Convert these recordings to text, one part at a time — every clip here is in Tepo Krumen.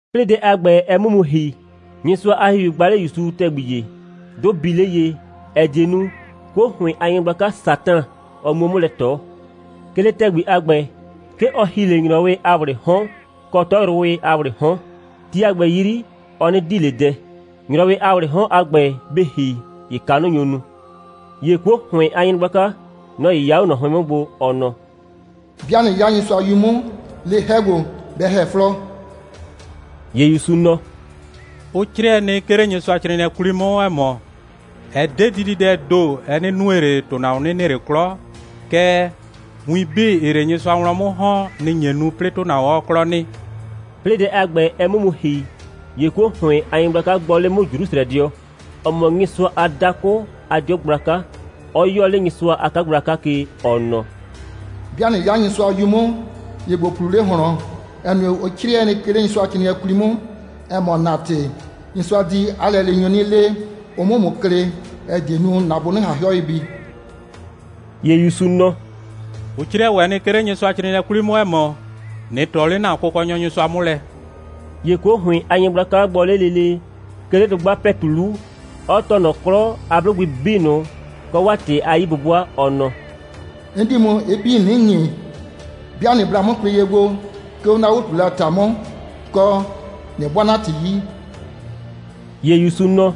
'Plɩɩ dɛ a ‑gbɛ, ɛ 'mʋ mu ‑hi, Nyɩsʋa a ‑Hihiu gba 'le ‑Yusu ‑tɛgbi ‑ye, 'dʋ bii 'le ye, ‑ɛ die nu, 'kuo ‑hʋɩn a nyɩgblaka Satan, ɔ 'muo 'mʋ lɛ ꞊tɔ. 'Ke 'le ‑tɛgbi a ‑gbɛ, 'ke ɔ ‑hi 'le ‑nyrɔwɩ a ‑wlɩɩ 'hɔn kɔ 'tɔyrʋwɩ a ‑wlɩɩ 'hɔn. Ti a ‑gbɛ 'yri, ɔ 'nɩ di ꞊le dɛ. ‑Nyrɔwɩ a ‑wlɩɩ 'hɔn a ‑gbɛ, bɩ ‑hi, ‑ye kanʋ nyo nu. ‑Ye 'kuo ‑hʋɩn a nyɩgblaka, nɔ‑ 'yɩya 'o ꞊nɔ 'hʋɩn 'mʋ gbo, ɔ nɔ: «'Bɩa ꞊nɩ 'ya Nyɩsʋa a 'Yu 'mʋ, le 'hɛ ‑gbo, bɛ ‑hɛ 'flɔɔ.» ‑Ye ‑Yusu nɔ: «Ʋ 'crɩɛ nɩ, 'ke 'le Nyɩsʋacrɩɩnɩɛ 'kwli 'mʋ, ‑ɛ mɔ: Ɛ 'de dididɛɛ ‑do, ɛ 'nɩ nue ꞊le, ‑tʋnahuon 'nɩ nɩ ꞊le 'klɔ, kɛɛ, win 'bii, ‑ɩɩ 'le Nyɩsʋa wlɔn 'mʋ ‑hɔn, nɩ‑ nye nu, 'plɩɩ ‑tʋnahuon 'ɔɔ 'klɔ nɩ.» 'Plɩɩ dɛ a ‑gbɛ, ɛ 'mʋ mu ‑hi, ‑ye 'kuo ‑hʋɩn a nyɩgblaka gbɔ 'le 'mʋ Jrusrɛdɩɔ, ‑ɔ mɔ Nyɩsʋa a dakʋ a 'dɩɔ gblaka, 'ɔ 'yɔɔ 'le Nyɩsʋa a 'kagblaka ke, ɔ nɔ: «'Bɩa ꞊nɩ 'ya Nyɩsʋa a 'Yu 'mʋ, ‑ye ‑bo ꞊pluu 'le ꞊hlɔn, ‑ɛ nue, ʋ 'crɩɛ nɩ, 'ke 'le Nyɩsʋacrɩɩnɩɛ 'kwli 'mʋ, ‑ɛ mɔ: ‑Na ‑tɩ, Nyɩsʋa di 'a lɛleenyʋ 'nɩ le, ʋ 'mʋ ‑mʋ klɩ, ‑ɛ die nu, ‑na bʋ 'nɩ ꞊han 'hɩɔ ye bi.» ‑Ye ‑Yusu nɔ: «Ʋ 'crɩɛ ‑wɛ nɩ, 'ke 'le Nyɩsʋacrɩɩnɩɛ 'kwli 'mʋ, ‑ɛ mɔ: ꞊Nɩ ꞊tɔ 'le ‑na Kʋkɔnyɔ Nyɩsʋa 'mʋ lɛ.» ‑Ye 'kuo ‑hʋɩn a nyɩgblaka gbɔ 'le lele, 'ke 'le dʋgba ‑pɛtu 'lu, 'ɔ tɔɔ ꞊nɔ 'klɔ a 'blʋgbɩ 'bii ꞊nʋ kɔ 'waa ‑tɩ a 'yi'bʋbʋa, ɔ nɔ: «'N di ‑mʋ ɩ 'bii 'nɩ ‑nyi, 'bɩa ꞊nɩ bla 'mʋ kwlɩ ye gbo, 'ke 'o 'na 'o꞊tuulɛ a ‑ta 'mʋ, kɔ, ꞊nɩ 'bʋaa 'na ‑tɩ 'yi.» ‑Ye ‑Yusu nɔ: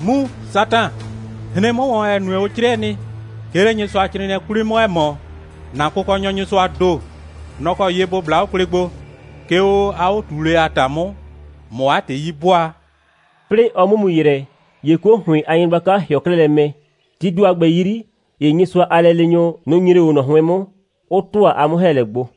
«Mu, Satan, hren 'mʋ ‑wɔn, ‑ɛ nue, ʋ 'crɩɛ nɩ, 'ke 'le Nyɩsʋacrɩɩnɩɛ 'kwli 'mʋ, ‑ɛ mɔ: ‑Na Kʋkɔnyɔ Nyɩsʋaa ‑do, nɔ‑ kɔ ye ‑bo bla 'o kwlɩ gbo, 'ke 'o 'a 'o꞊tuulɛ a ‑ta 'mʋ, ꞊mʋ 'a ‑tɩ 'yi 'bʋaa.» 'Plɩɩ ɔ 'mʋ mu ‑yrɛ, ‑ye 'kuo ‑hʋɩn a nyɩgblaka ‑hɩɔ 'klɛɛ lɛ mɛ. Tii ‑do a ‑gbɛ 'yri, ‑ye Nyɩsʋa a lɛleenyʋ, nʋ‑ nyre 'o ꞊nɔ 'hʋɩn 'mʋ, 'ʋ ‑tʋa 'a 'mʋ‑hɛɛlɛ gbo.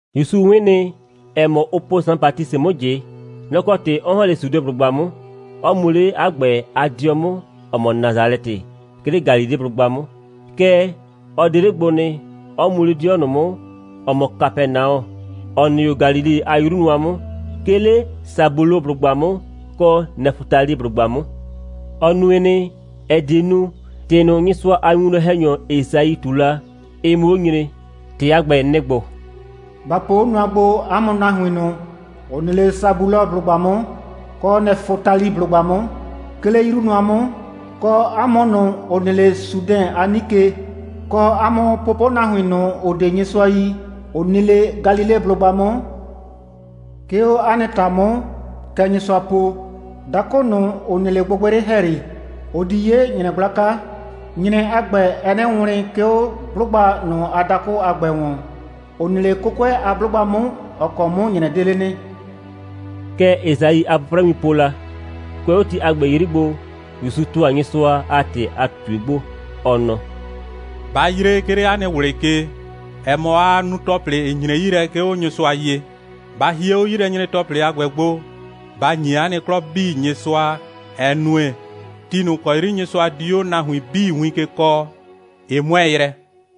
‑Yusu 'wɩn nɩ, ‑ɛ mɔ, ʋ po Saan Batisɩ 'mʋ ꞊jɩ. Nɔ‑ kɔ ‑tɩ 'ɔ ‑hɔn 'le Sudeblʋgba 'mʋ, 'ɔ mu 'le 'a ‑gbɛ a 'dɩɔ 'mʋ, ‑ɔ mɔ Nasalɛtɩ, 'ke 'le Galileblʋgba 'mʋ. Kɛɛ, ɔ 'de 'le gbo nɩ, 'ɔ mu 'le 'dɩɔ ꞊nʋ 'mʋ, ‑ɔ mɔ Kapɛnaɔ, ‑ɔ nɩ 'o Galile a 'yru nʋa 'mʋ, 'ke 'le Sabuloblʋgba 'mʋ kɔ Nɛfʋtaliblʋgba 'mʋ. Ɔ nue nɩ, ‑ɛ die nu, ‑tɩ ꞊nʋ, Nyɩsʋa a winwlɔn‑hɛnyɔ Esai ꞊tu la, ɩ 'mʋ 'o nyre. ‑Tɩ a ‑gbɛ, nɩ‑ ‑gbo: «Ba po 'o nʋa gbo, 'a mʋ nahuin ꞊nʋ, ‑ʋ nɩ 'le Sabuloblʋgba 'mʋ kɔ Nɛfʋtaliblʋgba 'mʋ, 'ke 'le 'yru nʋa 'mʋ, kɔ 'a mʋ ꞊nʋ, ‑ʋ nɩ 'le Sudɛn a 'nike, kɔ 'a mʋ pʋpʋnahuin ꞊nʋ, ‑ʋ 'de Nyɩsʋa yi, ‑ʋ nɩ 'le Galileblʋgba 'mʋ. 'Ke 'o 'a nɩ ‑ta 'mʋ, kɛ Nyɩsʋa po: Dakʋ ꞊nʋ, ‑ʋ nɩ 'le gbɩgbɩyrɩ ‑hɛyri, ʋ di 'ye ‑nyrɛ gblaka. ‑Nyrɛ a ‑gbɛ, ɛɛ 'nɩ wlɩn, 'ke 'o 'blʋgba ꞊nʋ a dakʋ a ‑gbɛ ‑wɔn, ‑ʋ nɩ 'le 'kʋkʋɛ a 'blʋgba 'mʋ, ‑ɔ kɔ 'mʋ ‑nyrɛ 'de 'le nɩ.» Kɛ Esai a 'pʋprɛwin po la. Kʋɛ 'o ti a ‑gbɛ 'yri gbo, ‑Yusu ‑tʋa Nyɩsʋa a ‑tɩ a ꞊tutue gbo, ɔ nɔ: «Ba yree, 'ke 'le 'a nɩ ꞊wlɩ ke, ‑ɛ mɔ, aa nu ‑tɔplɩ, ‑ɩ nyre 'yi lɛ, 'ke 'o Nyɩsʋa ye. Ba hie 'o 'yilɛnyre‑tɔplɩ a ‑gbɛ gbo, ba ‑nyi 'a nɩ 'klɔ 'bii Nyɩsʋa, ‑ɛ nue, ti ꞊nʋ ‑kɔ 'yri Nyɩsʋa di 'o nahuin 'bii win ke kɔɔ, ɩ 'mʋɛɛ yrɛ.»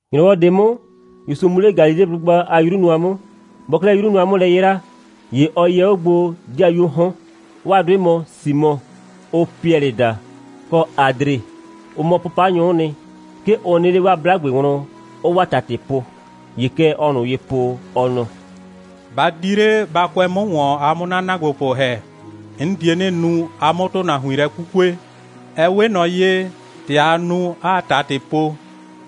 ‑Nyrɔwɔ ꞊de 'mʋ, ‑Yusu mu 'le Galileblʋgba a 'yru nʋa 'mʋ. Bɔɔ 'klɛɛ 'yru nʋa 'mʋ lɛ 'yraa, ‑ye ɔ yɛ 'o gbo ‑dɩayuoo 'hɔn. 'Waa 'dʋɩ mɔ Simɔ, ʋʋ Piɛlɩ daa, kɔ Adre. Ʋ mɔ 'pʋpanyʋ'ʋ nɩ. 'Ke ʋ nɩ 'le 'waa 'blagbe wlɔn, 'ʋʋ 'waa ‑tatɩ po. ‑Ye kɛ ɔɔ ꞊nʋ ye po, ɔ nɔ: «Ba di 'le, ba kʋɛ 'mʋ ‑wɔn, a 'mʋ 'na ‑naagbopʋ ‑hɛ. 'N die 'nɩ nu, a 'mʋ ‑tʋnahuin lɛ 'kukue. Ɛ 'we ꞊nɔ ye, ‑tɛ aa nu, 'aa ‑tatɩ po,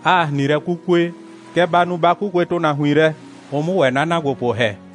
'aa ‑hrin lɛ 'kukue, kɛ ba nu, ba 'kukue ‑tʋnahuin lɛ, ʋ 'mʋ ‑wɛ 'na ‑naagbopʋ ‑hɛ.»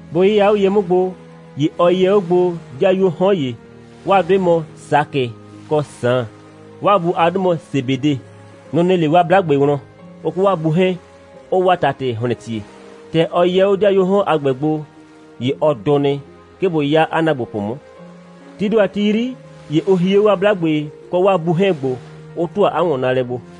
Bʋ 'yɩya 'o ye 'mʋ gbo, ‑ye ɔ yɛ 'o gbo ‑dɩayuoo 'hɔn ‑ye. 'Waa 'dʋɩ mɔ Sakɩ kɔ Saan. 'Waa bu a 'dʋ mɔ Sebede. Nʋ‑ nɩ 'le 'waa 'blagbe wlɔn, ʋ kɔ 'waa bu 'hɛɛn, 'ʋʋ 'waa ‑tatɩ ‑hlɛntie. ‑Tɛ ɔ yɛ 'o ‑dɩayuoo 'hɔn a ‑gbɛ gbo, ‑ye ɔ dʋ nɩ, 'ke bʋ 'ya 'a ‑naagbopʋ 'mʋ. Tii ‑do a ti 'yri, ‑ye ʋ hie 'o 'waa 'blagbe kɔ 'waa bu 'hɛɛn gbo, 'ʋ ‑tʋa 'a ‑wɔnnaalɛ gbo.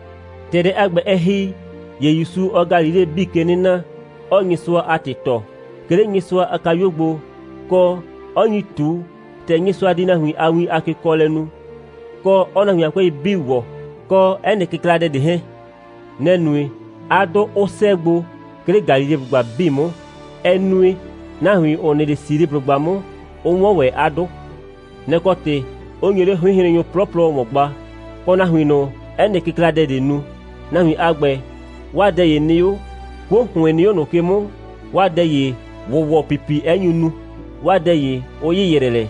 ‑Tɛ dɛ a ‑gbɛ, ɛ ‑hi, ‑ye ‑Yusu, ɔɔ Galileblʋgba 'bii ke 'nɩ na, 'ɔɔ Nyɩsʋa a ‑tɩ tɔɔ, 'ke 'le Nyɩsʋa a kayuo gbo, kɔ, 'ɔ nyi ꞊tu, ‑tɛ Nyɩsʋa di nahuin a win a kekɔɔlɛ nu, kɔ 'ɔɔ nahuin a 'kʋɛi 'bii ‑wɔ, kɔ 'ɛ nɩ kɩkladɛ ꞊de 'hɛɛn. Nɛ‑ nue, 'a 'dʋ 'ʋ 'sɛɛ gbo, 'ke 'le Galileblʋgba 'bii 'mʋ. Ɛ nue, nahuin, ‑ʋ nɩ 'le Siliblʋgba 'mʋ, 'ʋ 'wɔn ‑wɛ 'a 'dʋ. Nɛ‑ kɔ ‑tɩ 'ʋ nyo 'le 'hʋɩnhrennyʋ 'plɔplɔ ‑wɔn gba, kɔ nahuin ꞊nʋ, 'ɛ nɩ kɩkladɛ ꞊dee nu. Nahuin a ‑gbɛ, 'waa dɛ ‑ye nɩ 'o, 'kuo ‑hʋɩn nɩ 'o ꞊nʋ ke 'mʋ, 'waa dɛ ‑ye ‑wʋwɔpipi 'ɛ nyu nu, 'waa dɛ ‑ye 'ʋ ‑yɩyrɛ lɛ.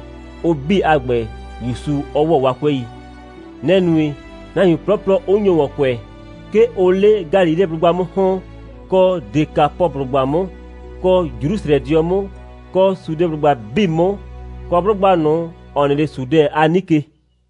Ʋ 'bii a ‑gbɛ, ‑Yusu 'ɔ ‑wɔ 'waa 'kʋɛi. Nɛ‑ nue, nahuin 'plɔplɔ 'ʋ nyo ‑wɔn kʋɛ. 'Ke ʋʋ 'le Galileblʋgba 'mʋ ‑hɔn, kɔ Dekapɔblʋgba 'mʋ, kɔ Jrusrɛdɩɔ 'mʋ, kɔ Sudeblʋgba 'bii 'mʋ, kɔ 'blʋgba ꞊nʋ, ‑ɔ nɩ 'le Sudɛn a 'nike.